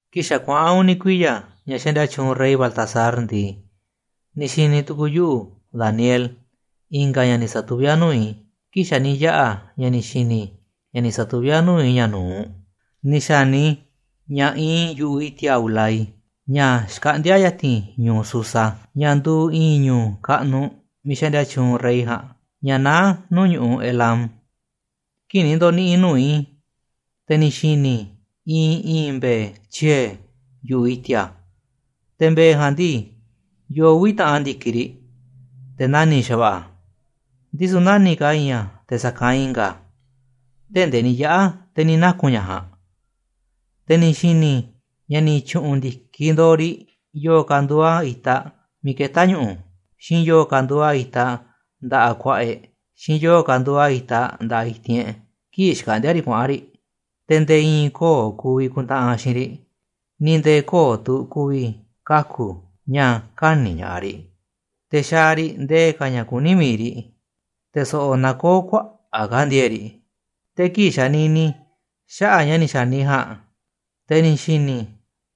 “Kii̱ꞌ xa̱ kuaꞌa̱n uni̱ kuiya̱ ña̱ xaꞌndia tyuunꞌ rey Baltasar ndii, ni̱ xi̱ni̱ tu̱ku̱u̱ yuꞌu̱, Daniel, i̱nga̱ ña̱ ni̱ sa̱tuví a̱ nuu̱ꞌ i̱, kii̱ꞌ xa̱ ni̱ yaꞌa̱ ña̱ ni̱ xi̱ni̱ i̱ ña̱ ni̱ sa̱tuví a̱ nuu̱ꞌ i̱ ña̱ nu̱uꞌ. Ni̱ xa̱ni i̱ ña̱ iinꞌ i̱ yu̱ꞌuꞌ i̱ti̱a̱ Ulai, ña̱ xkaꞌndi̱a̱ ya̱ti̱n ñu̱u̱ Susa, ña̱ nduuꞌ i̱i̱n ñu̱u̱ kaꞌnuꞌ miiꞌ xaꞌndia tyuunꞌ rey ja̱a̱nꞌ, ña̱ naá nuu̱ꞌ ñu̱ꞌuꞌ Elám. Kii̱ꞌ ni̱ ndo̱ni̱ꞌi̱ i̱ nuu̱ꞌ i̱, te̱ ni̱ xi̱ni̱ i̱ iinꞌ i̱i̱n mbe̱e̱ tyie̱ yu̱ꞌuꞌ i̱ti̱a̱. Te̱ mbe̱e̱ ja̱a̱nꞌ ndii, yoo uvi̱ taꞌan ndi̱kiꞌ riꞌ, te̱ nani̱ꞌ xa̱va̱ꞌa̱ a̱, ndisu̱ nani̱ꞌ ka̱ i̱i̱n a̱ te̱ sa̱kanꞌ i̱nga̱ a̱, tee̱ꞌ ndee ni̱ yaꞌa̱ te̱ ni̱ naku̱n ña̱ ja̱a̱nꞌ. Te̱ ni̱ xi̱ni̱ i̱ ña̱ ni̱ tyu̱ꞌu̱n ndi̱kiꞌ ndo̱o̱ riꞌ yo̱o̱ ka̱ nduuꞌ a̱ itaꞌ miiꞌ ketá ñu̱ꞌu̱, xiinꞌ yo̱o̱ ka̱ nduuꞌ a̱ itaꞌ nda̱ꞌaꞌ ku̱a̱ꞌa̱ e̱ꞌ, xiinꞌ yo̱o̱ ka̱ nduuꞌ a̱ itaꞌ nda̱ꞌaꞌ i̱ti̱n e̱ꞌ kii̱ꞌ xkaꞌndíá riꞌ kuaꞌa̱n riꞌ, te̱ nde̱e̱ i̱i̱n kö̱o̱ ku̱vi̱ ku̱ntaꞌanꞌ xiinꞌ riꞌ, ni̱ nde̱e̱ kö̱o̱ tu̱ ku̱vi̱ kaku̱ ña̱ kä̱ni̱ ña̱ꞌaꞌ riꞌ, te̱ xaaꞌ riꞌ nde̱e̱ ka̱ ña̱ kuní miiꞌ riꞌ, te̱ so̱ꞌo̱ nakoó kuaꞌa̱ꞌ ka̱ ndi̱e̱e̱ꞌ riꞌ. “Te̱ kii̱ꞌ xanini i̱ xaꞌa̱ꞌ ña̱ ni̱ xa̱ni i̱ ja̱a̱nꞌ, te̱ ni̱ xi̱ni̱ i̱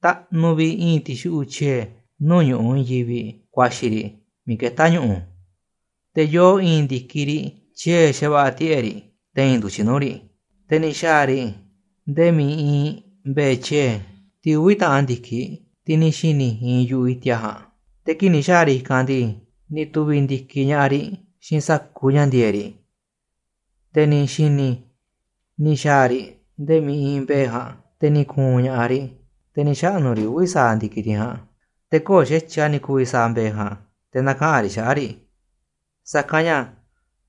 taꞌnuꞌ vi̱ꞌ i̱i̱n ti̱xuꞌu̱ꞌ tyie̱ nuu̱ꞌ ñu̱ꞌuꞌ i̱i̱n yivi̱ꞌ kuaxi̱ riꞌ miiꞌ ketá ñu̱ꞌu̱, te̱ yoo i̱i̱n ndi̱kiꞌ riꞌ tyie̱ xa̱va̱ꞌa̱ tiꞌe̱ꞌ riꞌ, te̱i̱n ndu̱tyiꞌ nuu̱ꞌ riꞌ. Te̱ ni̱ xa̱a̱ riꞌ nde̱e̱ miiꞌ iinꞌ mbe̱e̱ tyie̱, tiꞌ uvi̱ taꞌan ndi̱kiꞌ, tiꞌ ni̱ xi̱ni̱ iinꞌ yu̱ꞌuꞌ i̱ti̱a̱ ja̱a̱nꞌ, te̱ kii̱ꞌ ni̱ xa̱a̱ riꞌ i̱kanꞌ ndii, ni̱ tu̱vi̱ ndi̱kiꞌ ña̱ꞌaꞌ riꞌ xiinꞌ sa̱kuuꞌ ña̱ ndi̱e̱eꞌ riꞌ, te̱ ni̱ xi̱ni̱ i̱ ni̱ xa̱a̱ riꞌ nde̱e̱ miiꞌ iinꞌ mbe̱e̱ ja̱a̱nꞌ, te̱ ni̱ ku̱u̱n ña̱ꞌaꞌ riꞌ, te̱ ni̱ xaꞌnu̱ riꞌ uvi̱ sa̱aꞌ ndi̱kiꞌ tiꞌ ja̱a̱nꞌ, te̱ kö̱o̱ xa̱tyiꞌ a̱ ni̱ ku̱vi̱ sa̱a̱ mbe̱e̱ ja̱a̱nꞌ te̱ na̱kaꞌa̱n riꞌ xaꞌa̱ꞌ riꞌ, sa̱kanꞌ ña̱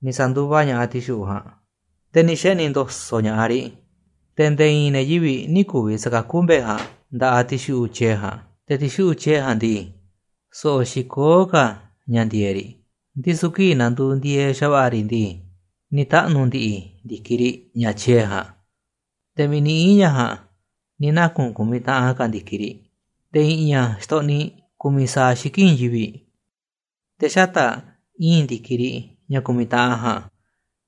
ni̱ sa̱nduva ña̱ꞌaꞌ ti̱xuꞌu̱ꞌ ja̱a̱nꞌ, te̱ ni̱ xeꞌni̱ ndo̱so̱ꞌ ña̱ꞌaꞌ riꞌ. Te̱ nde̱e̱ i̱i̱n ne̱ yivi̱ꞌ nï̱ ku̱vi̱ sa̱kakú mbe̱e̱ ja̱a̱nꞌ nda̱ꞌaꞌ ti̱xuꞌu̱ꞌ tyie̱ ja̱a̱nꞌ. Te̱ ti̱xuꞌu̱ꞌ tyie̱ ja̱a̱nꞌ ndii, so̱ꞌo̱ xikoó ka̱ ña̱ ndi̱e̱eꞌ riꞌ, ndisu̱ kii̱ꞌ na̱nduuꞌ ndi̱e̱eꞌ xa̱va̱ꞌa̱ riꞌ ndii, ni̱ taꞌnu̱ ndi̱ꞌi̱ ndi̱kiꞌ riꞌ, ña̱ tyie̱ ja̱a̱nꞌ, te̱ miiꞌ ni̱ ii̱n ña̱ ja̱a̱nꞌ ni̱ naku̱n ku̱miꞌ taꞌan ka̱ ndi̱kiꞌ riꞌ, te̱ i̱ꞌi̱n a̱ xtoꞌniꞌ ku̱miꞌ sa̱aꞌ xiki̱ꞌ i̱i̱n yivi̱ꞌ. “Te̱ xata̱ꞌ i̱i̱n ndi̱kiꞌ riꞌ, ña̱ ku̱miꞌ taꞌan ja̱a̱nꞌ,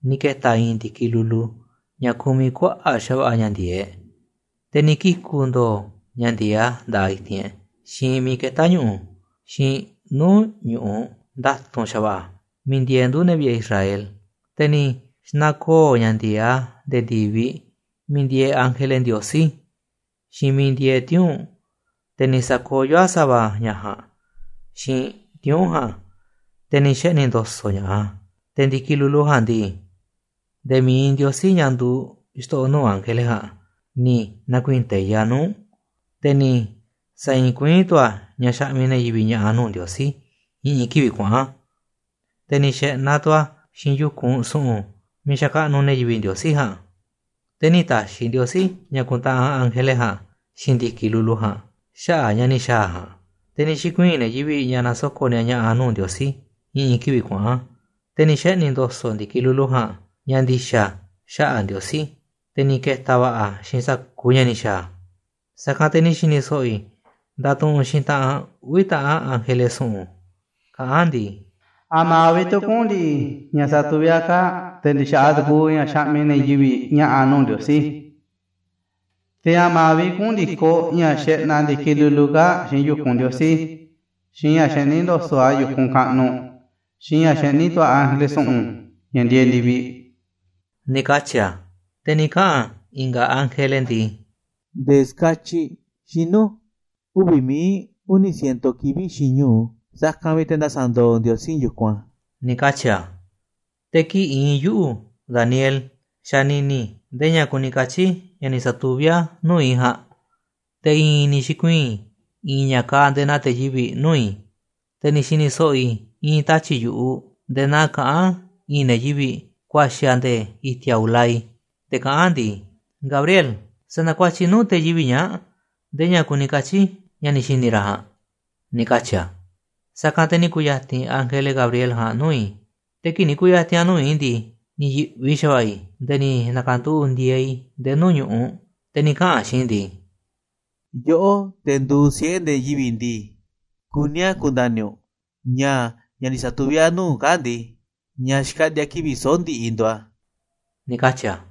ni̱ ke̱ta̱ i̱i̱n ndi̱kiꞌ lulu ña̱ kumiꞌ kuaꞌa̱ꞌ xa̱va̱ꞌa̱ ña̱ ndi̱e̱eꞌ, te̱ ni̱ kiku̱ ndo̱o̱ ña̱ ndi̱e̱eꞌ a̱ nda̱ꞌaꞌ i̱ti̱n e̱ꞌ, xiinꞌ miiꞌ ketá ñu̱ꞌu̱, xiinꞌ nuu̱ꞌ ñu̱ꞌuꞌ nda̱tu̱nꞌ xa̱va̱ꞌa̱, miiꞌ ndieeꞌ ndu̱ ne̱ vi̱ꞌe̱ Israel. Te̱ ni̱ xna̱koo̱ ña̱ ndi̱e̱eꞌ a̱ nde̱e̱ ndi̱viꞌ miiꞌ ndieeꞌ ángele Ndiosí, xiinꞌ miiꞌ ndieeꞌ tiuu̱nꞌ, te̱ ni̱ sa̱koyó a̱ sa̱va̱ ña̱ ja̱a̱nꞌ, xiinꞌ tiuu̱nꞌ ja̱a̱nꞌ, te̱ ni̱ xeꞌni̱ ndo̱so̱ꞌ ña̱ꞌaꞌ a̱. Te̱ ndi̱kiꞌ lulu ja̱a̱nꞌ ndii, nde̱e̱ mi̱iꞌ Ndiosí, ña̱ nduuꞌ xto̱ꞌo̱ nuu̱ꞌ ángele ja̱a̱nꞌ, ni̱ na̱kuii̱n teiꞌ a̱ nuuꞌ, te̱ ni̱ sa̱i̱i̱n kuiín tu̱ a̱ ña̱ xaꞌmiꞌ ne̱ yivi̱ꞌ ña̱ꞌa̱ nuu̱ꞌ Ndiosí i̱ꞌi̱n kivi̱ꞌ kuaꞌa̱n, te̱ ni̱ xe̱ꞌnaꞌ tu̱ a̱ xiinꞌ yu̱kunꞌ su̱ꞌu̱n miiꞌ xakaꞌnuꞌ ne̱ yivi̱ꞌ Ndiosí ja̱a̱nꞌ. Te̱ nï̱ ta̱xi̱ Ndiosí ña̱ ku̱ntaꞌanꞌ ángele ja̱a̱nꞌ xiinꞌ ndi̱kiꞌ lulu ja̱a̱nꞌ xaꞌa̱ꞌ ña̱ ni̱ xa̱a̱ a̱ ja̱a̱nꞌ. Te̱ ni̱ xi̱kuii̱n ne̱ yivi̱ꞌ ña̱ nasoko̱ꞌ ni̱a̱ ña̱ꞌa̱ nuu̱ꞌ Ndiosí i̱ꞌi̱n kivi̱ꞌ kuaꞌa̱n, te̱ ni̱ xeꞌni̱ ndo̱so̱ꞌ ndi̱kiꞌ lulu ja̱a̱nꞌ ña̱ ndi̱xa̱ xaꞌa̱ꞌ Ndiosí, te̱ ni̱ ke̱ta̱ va̱ꞌa̱ a̱ xiinꞌ sa̱kuuꞌ ña̱ ni̱ xa̱a̱ a̱. “Sa̱kanꞌ te̱ ni̱ xi̱ni̱ so̱ꞌo̱ i̱ ndatuꞌunꞌ xiinꞌ taꞌan uvi̱ taꞌan ángele su̱ꞌu̱n, kaꞌán a̱ ndii: ‘¿A̱ma̱ vi̱ꞌ tu̱ kuꞌu̱n ndi̱ꞌi̱ ña̱ satuví a̱ kaa̱ꞌ, te̱ ndi̱xa̱ꞌaꞌ tukuuꞌ ña̱ xaꞌmiꞌ ne̱ yivi̱ꞌ ña̱ꞌa̱ nuu̱ꞌ Ndiosí? ¿Te̱ a̱ma̱ vi̱ꞌ kuꞌu̱n ndi̱koꞌ ña̱ xeꞌnaꞌ ndi̱kiꞌ lulu kaa̱ꞌ xiinꞌ yu̱kunꞌ Ndiosí, xiinꞌ ña̱ xeꞌní ndo̱so̱ꞌ a̱ yu̱kunꞌ kaꞌnuꞌ, xiinꞌ ña̱ xeꞌní tu̱ a̱ ángele su̱ꞌu̱n, ña̱ ndieeꞌ ndi̱viꞌ?,’ ni̱ katyi̱ a̱. “Te̱ ni̱ kaꞌa̱n i̱nga̱ ángele ndii: ‘Nde̱e̱ ska̱tyiꞌ xinu̱ uvi̱ mií uni̱ ciento kivi̱ꞌ xiinꞌ ñu̱u. Sa̱kanꞌ vi̱ꞌ te̱ nda̱sa̱ndo̱o̱ Ndiosí yu̱kunꞌ a̱,’ ni̱ katyi̱ a̱. “Te̱ kii̱ꞌ iinꞌ yuꞌu̱, Daniel, xanini i̱ ndee ña̱ kuni katyi̱ ña̱ ni̱ sa̱tuví a̱ nuu̱ꞌ i̱ ja̱a̱nꞌ, te̱ i̱i̱n ni̱ xi̱kuii̱n i̱i̱n ña̱ kaaꞌ nde̱e̱ naa te̱ yivi̱ꞌ nuu̱ꞌ i̱, te̱ ni̱ xi̱ni̱ so̱ꞌo̱ i̱ i̱i̱n tatyi̱ꞌ yu̱ꞌuꞌ nde̱e̱ naa kaꞌán i̱i̱n ne̱ yivi̱ꞌ kuaxi̱ a̱ nde̱e̱ i̱ti̱a̱ Ulai, te̱ kaꞌán a̱ ndii: ‘Gabriel, sa̱na̱kuatyiꞌ nuu̱ꞌ te̱ yivi̱ꞌ ñaa̱ꞌ nde̱e̱ ña̱ kuni katyi̱ ña̱ ni̱ xi̱ni̱ ra̱ ja̱a̱nꞌ,’ ni̱ katyi̱ a̱. “Sa̱kanꞌ te̱ ni̱ ku̱ya̱ti̱n ángele Gabriel ja̱a̱nꞌ nuu̱ꞌ i̱, te̱ kii̱ꞌ ni̱ ku̱ya̱ti̱n a̱ miiꞌ iinꞌ i̱ ndii, ni̱ yi̱ꞌvi xa̱va̱ꞌa̱ i̱, nde̱e̱ ni̱ na̱ka̱nduꞌu̱ꞌ ndi̱e̱e̱ i̱ nde̱e̱ nuu̱ꞌ ñu̱ꞌuꞌ, te̱ ni̱ kaꞌa̱n a̱ xiinꞌ i̱ ndii: ‘Yoꞌó, te̱ nduuꞌ siꞌe̱ ne̱ yivi̱ꞌ ndii, kuní a̱ ku̱nda̱ni̱ u̱nꞌ ña̱, ña̱ ni̱ sa̱tuví a̱ nuu̱ꞌ u̱nꞌ kaa̱ꞌ ndii, ña̱ xkaꞌndi̱a̱ kivi̱ꞌ soꞌo̱ꞌ ndiꞌiꞌ nduuꞌ a̱,’ ni̱ katyi̱ a̱.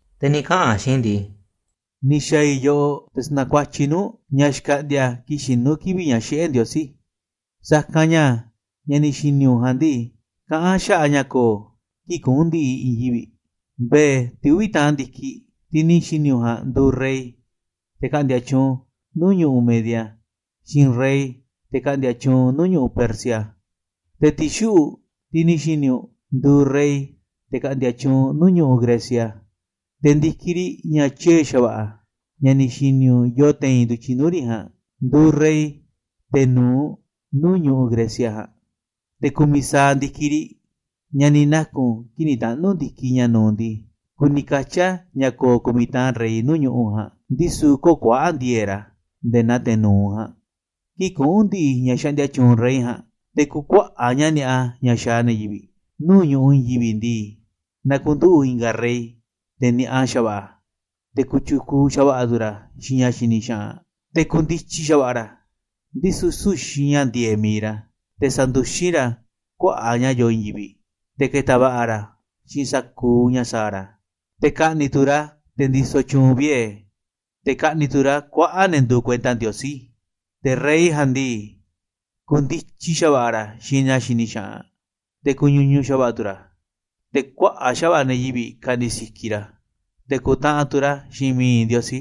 Te̱ ni̱ kaꞌa̱n a̱ xiinꞌ i̱ ndii: ‘Ni̱ xa̱a̱ i̱ yoꞌoꞌ te̱ sa̱na̱kuatyiꞌ i̱ nuu̱ꞌ u̱nꞌ ña̱ xkaꞌndi̱a̱ kii̱ꞌ xinu̱ kivi̱ꞌ ña̱ xiꞌé Ndiosí, sa̱kanꞌ ña̱ ña̱ ni̱ xi̱ni̱ u̱nꞌ ja̱a̱nꞌ ndii, kaꞌán a̱ xaꞌa̱ꞌ ña̱ ko̱o̱ kii̱ꞌ kuꞌu̱n ndi̱ꞌi̱ i̱i̱n yivi̱ꞌ. Mbe̱e̱, tiꞌ uvi̱ taꞌan ndi̱kiꞌ, tiꞌ ni̱ xi̱ni̱ u̱nꞌ ja̱a̱nꞌ nduuꞌ rey, te̱ ka̱ꞌndi̱a̱ tyuunꞌ nuu̱ꞌ ñu̱ꞌuꞌ Media, xiinꞌ rey, te̱ ka̱ꞌndi̱a̱ tyuunꞌ nuu̱ꞌ ñu̱ꞌuꞌ Persia. Te̱ ti̱xuꞌu̱ꞌ, tiꞌ ni̱ xi̱ni̱ u̱nꞌ, nduuꞌ rey, te̱ ka̱ꞌndi̱a̱ tyuunꞌ nuu̱ꞌ ñu̱ꞌuꞌ Grecia, te̱ ndi̱kiꞌ riꞌ, ña̱ tyie̱ xa̱va̱ꞌa̱, ña̱ ni̱ xi̱ni̱ u̱nꞌ yoo te̱i̱n ndu̱tyiꞌ nuu̱ꞌ riꞌ ja̱a̱nꞌ, nduuꞌ rey, te̱ nu̱uꞌ, nuu̱ꞌ ñu̱ꞌuꞌ Grecia ja̱a̱nꞌ. Te̱ ku̱miꞌ sa̱aꞌ ndi̱kiꞌ riꞌ, ña̱ ni̱ naku̱n kii̱ꞌ ni̱ taꞌnu̱ ndi̱kiꞌ ña̱ nu̱uꞌ ndii, kuni katyi̱ a̱ ña̱ ko̱o̱ ku̱miꞌ taꞌan rey nuu̱ꞌ ñu̱ꞌuꞌ ja̱a̱nꞌ, ndisu̱ kö̱o̱ kuaꞌa̱ꞌ ndi̱e̱e̱ꞌ ra̱ nde̱e̱ naa te̱ nu̱uꞌ ja̱a̱nꞌ. ‘Kii̱ꞌ kuꞌu̱n ndi̱ꞌi̱ ña̱ xaꞌndia tyuunꞌ rey ja̱a̱nꞌ, te̱ ku̱kuaꞌa̱ꞌ ña̱ ni̱a̱ꞌa ña̱ xaaꞌ ne̱ yivi̱ꞌ nuu̱ꞌ ñu̱ꞌuꞌ i̱i̱n yivi̱ꞌ ndii, na̱ku̱nduꞌu̱ꞌ i̱nga̱ rey, te̱ ni̱a̱ꞌa xa̱va̱ꞌa̱, te̱ kotyukuuꞌ xa̱va̱ꞌa̱ tu̱ ra̱ xiinꞌ ña̱ xini xaꞌanꞌ. Te̱ ku̱ndityi xa̱va̱ꞌa̱ ra̱, ndisu̱ süu̱ꞌ xiinꞌ ña̱ ndi̱e̱eꞌ mi̱iꞌ ra̱, te̱ sa̱nduxín ra̱ kuaꞌa̱ꞌ ña̱ yoo i̱i̱n yivi̱ꞌ, te̱ ke̱ta̱ va̱ꞌa̱ ra̱ xiinꞌ sa̱kuuꞌ ña̱ sa̱a̱ ra̱. Te̱ ka̱ꞌni̱ꞌ tu̱ ra̱ te̱ ndisoꞌ tyuunꞌ vie̱, te̱ ka̱ꞌni̱ꞌ tu̱ ra̱ kuaꞌa̱ꞌ ne̱ nduuꞌ kuenta Ndiosí. Te̱ rey ja̱a̱nꞌ ndii, ku̱ndityi xa̱va̱ꞌa̱ ra̱ xiinꞌ ña̱ xini xaꞌanꞌ, te̱ ku̱ñuñuꞌ xa̱va̱ꞌa̱ tu̱ ra̱. Te̱ kuaꞌa̱ꞌ xa̱va̱ꞌa̱ ne̱ yivi̱ꞌ ka̱ꞌni̱ꞌ sikiꞌ ra̱. Te̱ ku̱ntaꞌanꞌ tu̱ ra̱ xiinꞌ mi̱iꞌ Ndiosí,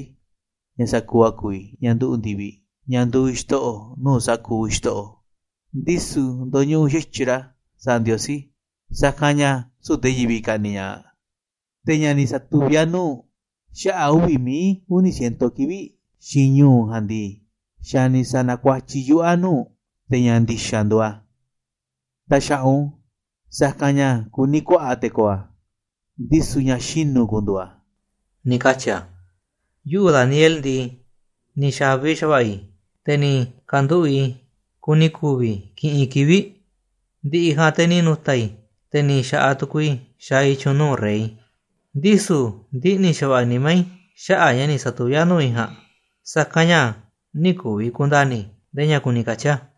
ña̱ sa̱kuuꞌ a̱ ku̱vi̱, ña̱ nduꞌu̱ꞌ ndi̱viꞌ, ña̱ nduuꞌ Xto̱ꞌo̱ nuu̱ꞌ sa̱kuuꞌ xto̱ꞌo̱, ndisu̱ ndo̱ñuꞌuꞌ xa̱tyiꞌ ra̱ sa̱a̱ Ndiosí, sa̱kanꞌ ña̱ süu̱ꞌ te̱ yivi̱ꞌ ka̱ꞌni̱ꞌ ña̱ꞌaꞌ. ‘Te̱ ña̱ ni̱ satuví a̱ nuu̱ꞌ u̱nꞌ xaꞌa̱ꞌ uvi̱ mií uni̱ ciento kivi̱ꞌ xiinꞌ ñu̱u ja̱a̱nꞌ ndii, xa̱ ni̱ sa̱na̱kuatyiꞌ yuꞌu̱ a̱ nuu̱ꞌ u̱nꞌ, te̱ ña̱ ndi̱xa̱ nduuꞌ a̱. Ta̱xa̱ꞌa̱ u̱nꞌ u̱n, sa̱kanꞌ ña̱ kuní kuaꞌa̱ꞌ te̱ ko̱o̱ a̱, ndisu̱ ña̱ xinu̱ ku̱ndu̱u̱ a̱,’ ni̱ katyi̱ a̱. “Yuꞌu̱ Daniel ndii, ni̱ xa̱vi xa̱va̱ꞌa̱ i̱, te̱ ni̱ ka̱nduꞌu̱ꞌ i̱ kuni ku̱vi̱ i̱ kiꞌinꞌ kivi̱ꞌ, ndi̱ꞌi̱ ja̱a̱nꞌ te̱ ni̱ nu̱ta̱ i̱, te̱ ni̱ xa̱ꞌaꞌ tukuuꞌ i̱ xaaꞌ i̱ tyu̱u̱n nuu̱ꞌ rey, ndisu̱ ndiꞌni̱ xa̱va̱ꞌa̱ nimá i̱ xaꞌa̱ꞌ ña̱ ni̱ sa̱tuví a̱ nuu̱ꞌ i̱ ja̱a̱nꞌ, sa̱kanꞌ ña̱ nï̱ ku̱vi̱ ku̱nda̱ni̱ i̱ ndee ña̱ kuni katyi̱ a̱.